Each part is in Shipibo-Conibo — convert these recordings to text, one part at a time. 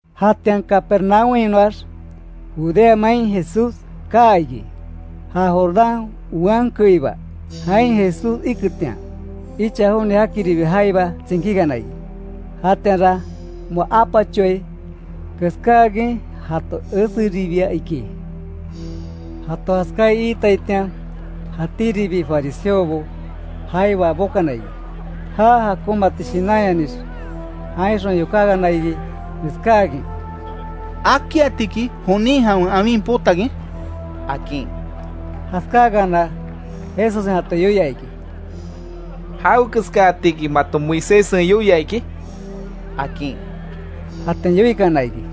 Jatian Capernaúmhainoax, Judea main Jesús kaa iki; ja Jordán wean keiba. Jain Jesús iketian, icha joni jakiribi jaiba tsinkíkana iki. Jatianra, moa apachoai keskáakin jato eseribia iki. Jato jaskaí iitaitian, jatíribi fariseobo jaiba bokana iki, já jakonmati shinanyanix, jainxon yokákana iki, neskákin: —¿Akiatiki jonin jawen awin potakin? —akin. Jaskáakana, Jesussen jato yoia iki: —¿Jawekeskaatiki mato Moiséssen yoia iki? —akin. Jatian yoikana iki: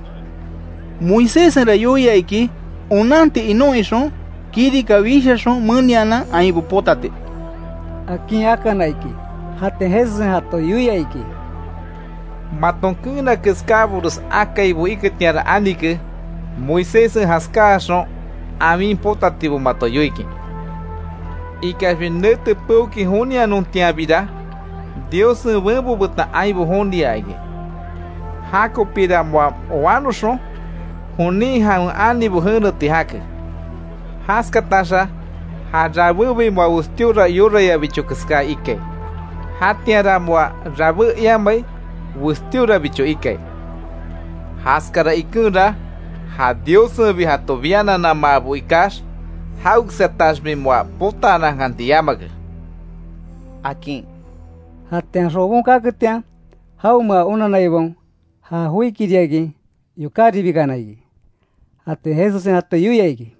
—Moiséssenra yoia iki onanti inon ixon, kirika wishaxon menianan ainbo potati —akin akana iki. Jatian Jesussen jato yoia iki: —Maton keena keskábores akaibo iketianra anike, Moiséssen jaskáxon awin potatibo mato yoikin. Ikaxbi nete peokin jonianontianbira, Diossen benbo betan ainbo joniaa iki. Jakopira moa wanoxon jonin jawen anibo jeneti jake. Jaskataxa ja rabébi moa westíora yorayabicho keská ikai. Jatianra moa rabé imai, westíorabicho ikai. Jaskara ikenra, ja Diossenbi jato biananamaabo ikax, jawekeskataxbi moa potaanankanti yamake —akin. Jatian xobon kaketian, jaonmea onanaibaon ja joikiriakin yokáribikana iki. Jatian Jesussen jato yoia iki: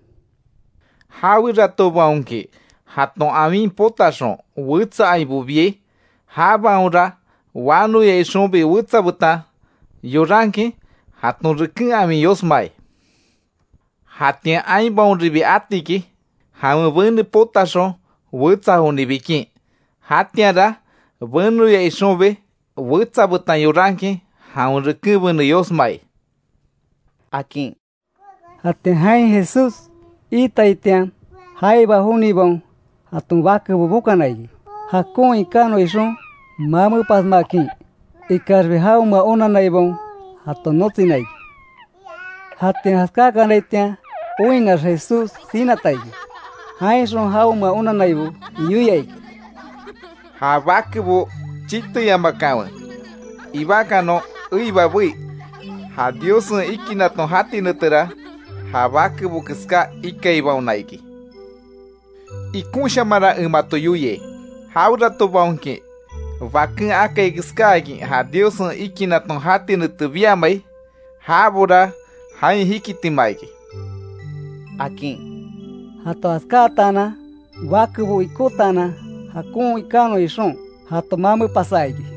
—Jaweratobaonki, jaton awin potaxon, wetsa ainbo biai, jabaonra wanoya ixonbi wetsa betan yorankin, jaton reken awin yosmai. Jatian ainbaonribi atiki, jawen bene potaxon wetsa joni bikin, jatianra benoya ixonbi wetsa betan yorankin, jawen reken bene yosmai —akin. Jatian jain Jesús iitaitian, jaiba jonibaon jaton bakebo bokana iki, jakon ikanon ixon mamepasmakin. Ikaxbi jaonmea onanaibaon jato notsina iki. Jatian jaskákanaitian oinnax Jesús sinata iki, jainxon jaonmea onannaibo yoia iki: —Ja bakebo chiteyamakanwe, ibakanon eiba bei. Ja Diossen ikinnaton jati netera, ja bakebo keská ikaibaona iki. Ikonshamanra en mato yoiai, jaweratobaonki baken akai keskáakin ja Diossen ikinnaton jati nete biamai, jabora jain jikitima iki —akin. Jato jaskáatanan, bakebo ikótaanan jakon ikanon ixon jato mamepasa iki.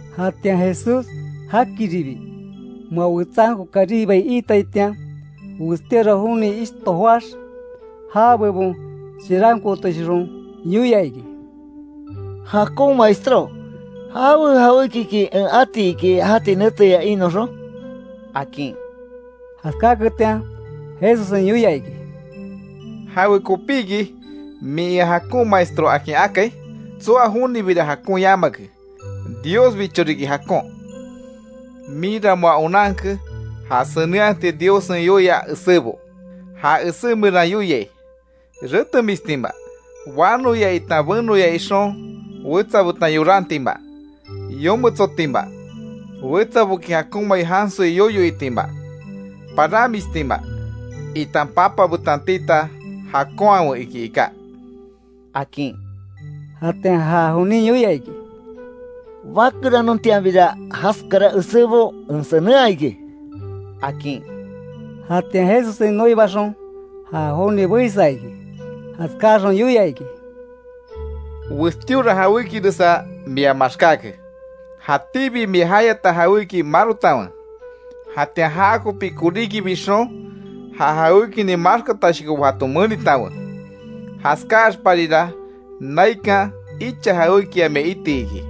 Jatian Jesús jakiribi, moa wetsanko karibai iitaitian, westíora joni ishto joáx, já bebon chirankootoshixon, yoia iki: —Jakon Maestro ¿Jawe jawékiki en ati iki jati neteya inoxon? —akin. Jaskáketian, Jesussen yoia iki: —¿Jawekopiki min ea jakon Maestro akin akai? Tsoa jonibira jakon yamake, Diosbicho riki jakon. Minra moa onanke, ja senenhati Diossen yoia esébo. Ja esé meran yoiai: Retemistima, wanoya itan benoya ixon wetsa betan yorantima, yometsotima, wetsaboki jakonmai jansoi yoyo itima, paranmistima, itan papa betan tita jakonhawe iki iká —akin. Jatian ja jonin yoia iki: —Bakeranontianbira jaskara esébo en senenhaa iki —akin. Jatian Jesussen noibaxon ja joni beisa iki; jaskáxon yoia iki: —Westíora jawékiresa mia maxkáke. Jatíbi mia jayata jawéki marotanwe, jatian jakopi koríki bixon, ja jawékinin maxkatashokobo jato menitanwe. Jaskáaxparira naikan, icha jawékia mia iti iki.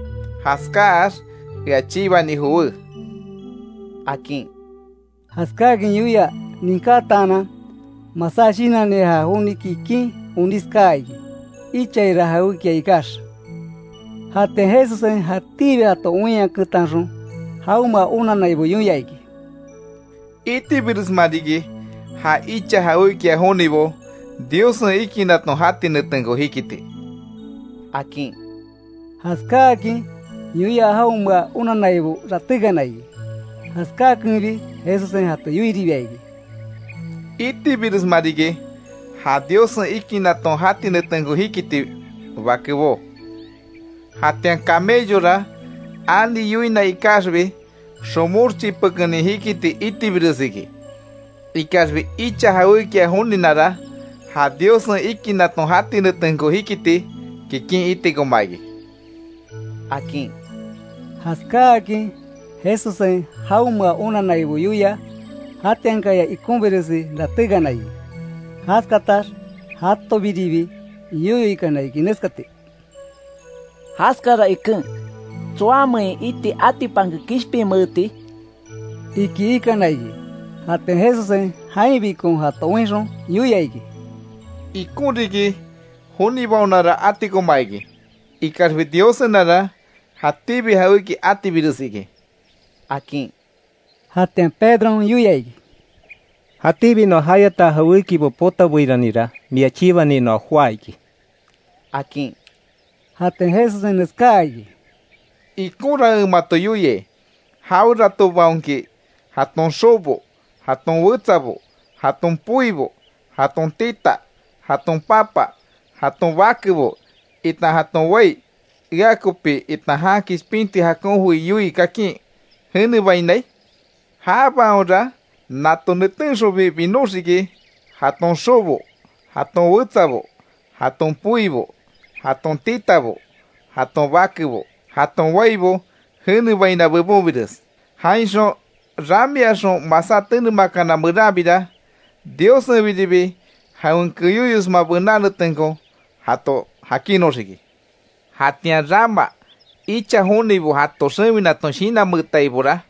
Jaskáax, ea chibani jowé —akin. Jaskáakin yoia ninkataanan, masá shinanni ja joni kikin onís kaa iki. Ichaira jawékia ikax. Jatian Jesussen jatíbi jato oinyaketanxon, jaonmea onannaibo yoia iki: —Itibiresma riki, ja icha jawékia jonibo Diossen ikinnaton jati netenko jikiti —akin. Jaskáakin yoia jaonmea onannaibo ratékana iki. Jaskakenbi, Jesussen jato yoiribia iki: —¡Itibiresma riki ja Diossen ikinnaton jati netenko jikiti, bakebó! Jatian camellora ani yoina ikaxbi, xomox chipekenin jikiti itibires iki, ikaxbi icha jawékia joninara, ja Diossen ikinnaton jati netenko jikiti kikin itikoma iki —akin. Jaskáakin Jesussen jaonmea onanaibo yoia, jatiankaya ikonbiresi ratékana iki. Jaskatax jatobiribi yoyo ikana iki, neskati: —Jaskara iken ¿Tsoamein iti atipanke kishpinmeeti? —iki ikana iki. Jatian Jesussen jainbikon jato oinxon, yoia iki: —Ikon riki, jonibaonara atikoma iki, ikaxbi Diossenara, jatíbi jawéki atibires iki —akin. Jatian Pedron yoia iki: —Jatíbi noa jayata jawékibo potabeiranira mia chibani noa joá iki —akin. Jatian Jesussen neskaa iki: —Ikonra en mato yoiai, jaweratobaonki jaton xobo, jaton wetsabo, jaton poibo, jaton tita, jaton papa, jaton bakebo, itan jaton wai; ea kopi, itan jan kishpinti jakon joi yoii kakin jenebainai, jabaonra nato netenxonbi binoxiki, jaton xobo, jaton wetsabo, jaton poibo, jaton titabo, jaton bakebo, jaton waibo, jenebaina bebonbires. Jainxon ramiaxon masá tenemakana meranbira, Diossenbiribi jawen keyóyosma bená netenko jato jakinnoxiki. Jatian rama icha jonibo jato xewinaton, shinanmeetaibora,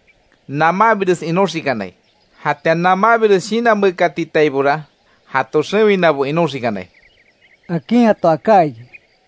namanbires inoxikanai. Jatian namanbires shinanmeekatitaibora, jato xewinabo inoxikanai —akin jato aká iki.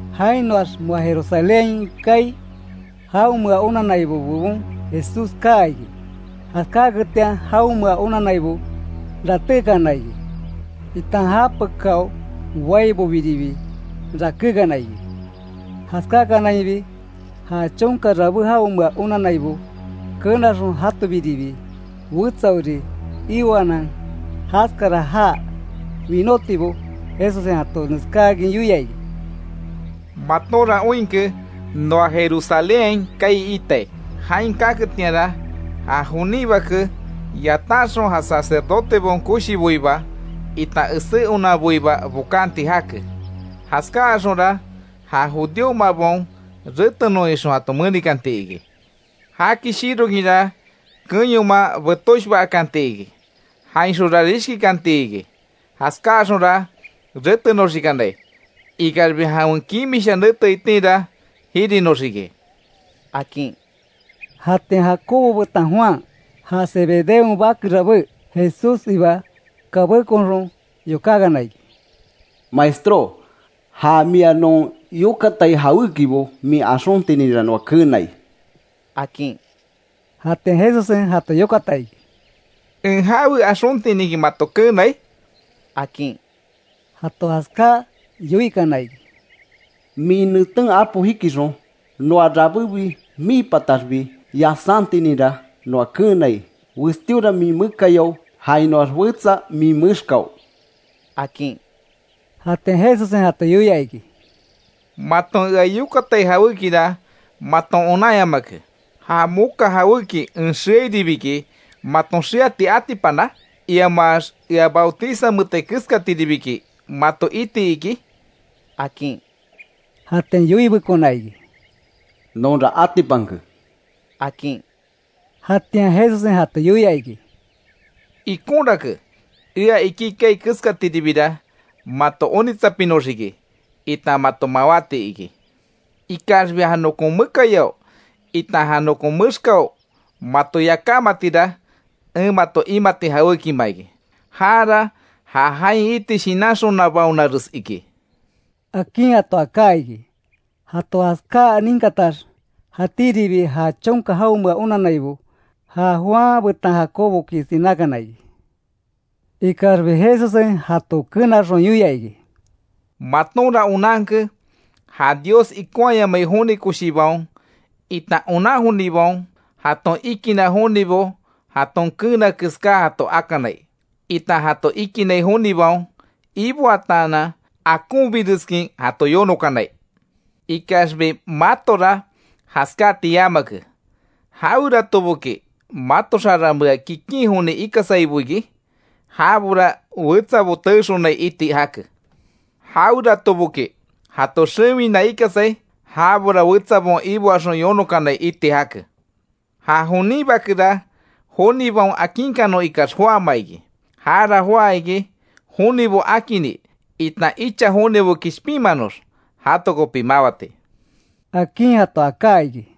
Jainoax moa Jerusalénhain kaai, jaonmea onannaibo bebon Jesús kaa iki. Jaskáketian jaonmea onannaibo ratékana iki, itan japekáo boaibobiribi rakékana iki. Jaskákanainbi, ja chonka rabé jaonmea onannaibo kenaxon jatobiribi wetsaori ioanan, jaskara já winótibo Jesussen jato neskáakin yoia iki: “Matonra oinke noa Jerusalénhain kaai iitai. Jain kaketianra, ja jonin Bake yatanxon, ja sacerdotebaon koshiboiba itan esé onanboiba bokanti jake. Jaskáaxonra, ja judíomabaon retenon ixon jato menikanti iki. Jaki shirokinra kenyoman betoshba akanti iki. Jainxonra rishkikanti iki. Jaskaáxonra retenoxikanai. Ikaxbi jawen kimisha nete itinra, jirinoxiki”, akin. Jatian Jacobo betan Juan, ja Zebedeon bake rabé, Jesússiba kabékonxon, yokákana iki: —Maestró, ja mia non yokatai jawékibo min axontininra noa keenai —akin. Jatian Jesussen jato yokata iki: —¿En jawe axontininki mato keenai? —akin. Jato jaskáa yoikana iki: —Min neten apo jikixon noa rabébi mii pataxbi yasántininra noa keenai; westíora min mekayao jainoax wetsa min mexkao —akin. Jatian Jesussen jato yoia iki: —Maton ea yokatai jawékira maton onanyamake ¿Ja moka jawéki en xeairibiki maton xeati atipana? Iamax ¿Ea bautizameetai keskatiribiki mato iti iki? —akin. Jatian yoibekona iki: —Nonra atipanke —akin. Jatian Jesussen jato yoia iki: —Ikonrake, ea iki kaai keskatiribira mato onitsapinoxiki itan mato mawáti iki. Ikaxbi ja nokon mekayao itan ja nokon mexkao mato yakámatira, en mato imati jawékima iki. Jara ja jain iti shinanxonabaonares iki —akin jato aká iki. Jato jaskáa ninkatax jatíribi ja chonka jaonmea onannaibo ja Juan betan Jacoboki sinákana iki. Ikaxbi Jesussen jato kenaxon yoia iki: —Matonra onanke ja Dios ikonhaayamai joni koshibaon, itan onan jonibaon jaton ikinna jonibo jaton keena keská jato akanai, itan jato ikinai jonibaon iboataanan akonbireskin jato yonokanai. Ikaxbi matora jaskáti yamake. Jaweratoboki mato xarameax kikin joni ikasaibo iki, jabora wetsabo teexonai iti jake. Jaweratoboki jato xewina ikasai, jabora wetsabaon iboaxon yonokanai iti jake. Ja jonin Bakera, jonibaon akinkanon ikax joáma iki, jara joá iki jonibo akini itan icha jonibo kishpinmanox jato kopi mawati —akin jato aká iki.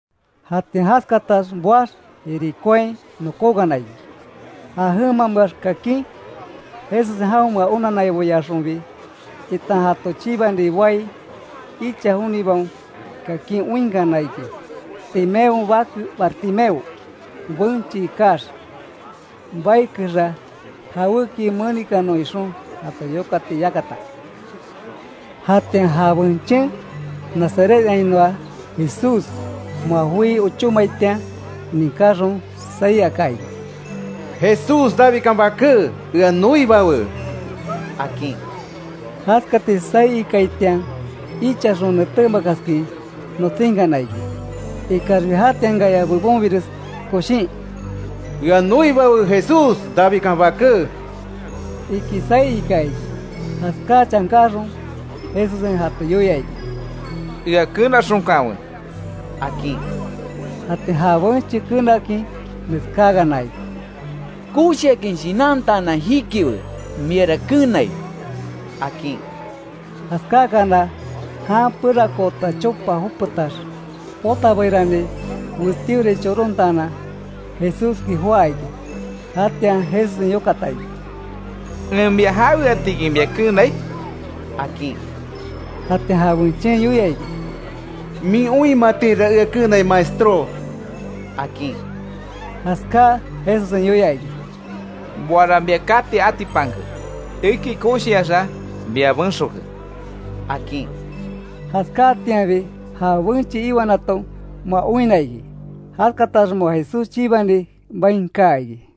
Jatian jaskatax boax Jericóain nokókana iki. Ja jemameax kakin Jesussen jaonmea onanaiboyaxonbi, itan jato chibani boai icha jonibaon kakin oinkana iki; Timeon bake Bartimeo, benche ikax baikexa jawéki menikanon ixon jato yokati yakata. Jatian ja benchen, Nazarethainoa Jesús moa joí ochómaitian ninkáxon saí aka iki: —¡Jesús, Davidkan Baké, ea noibawe! —akin. Jaskati saí ikaitian ichaxon netémakaskin notsínkana iki. Ikaxbi jatiankaya bebonbires koshin: —¡Ea noibawe Jesús, Davidkan Baké! —iki saí ika iki. Jaskáa chankáxon Jesussen jato yoia iki: —Ea kenaxonkanwe —akin. Jatian ja benche kenakin neskáakana iki: —Koshiakin shinantaanan jikiwe; miara kenai —akin. Jaskáakana jan perakoota chopa jopetax potabeirani westíorai chorontaanan, Jesúski joá iki. Jatian Jesussen yokata iki: —¿En mia jaweatiki mia keenai? —akin. Jatian ja benchen yoia iki: —Min oinmatinra ea keenai Maestró —akin. Jaskáa Jesussen yoia iki: —Moara mia kati atipanke, eki koshiaxa mia benxoke —akin. Jaskáatianbi ja benche iwanaton moa oinna iki. Jaskatax moa Jesús chibani bain kaa iki.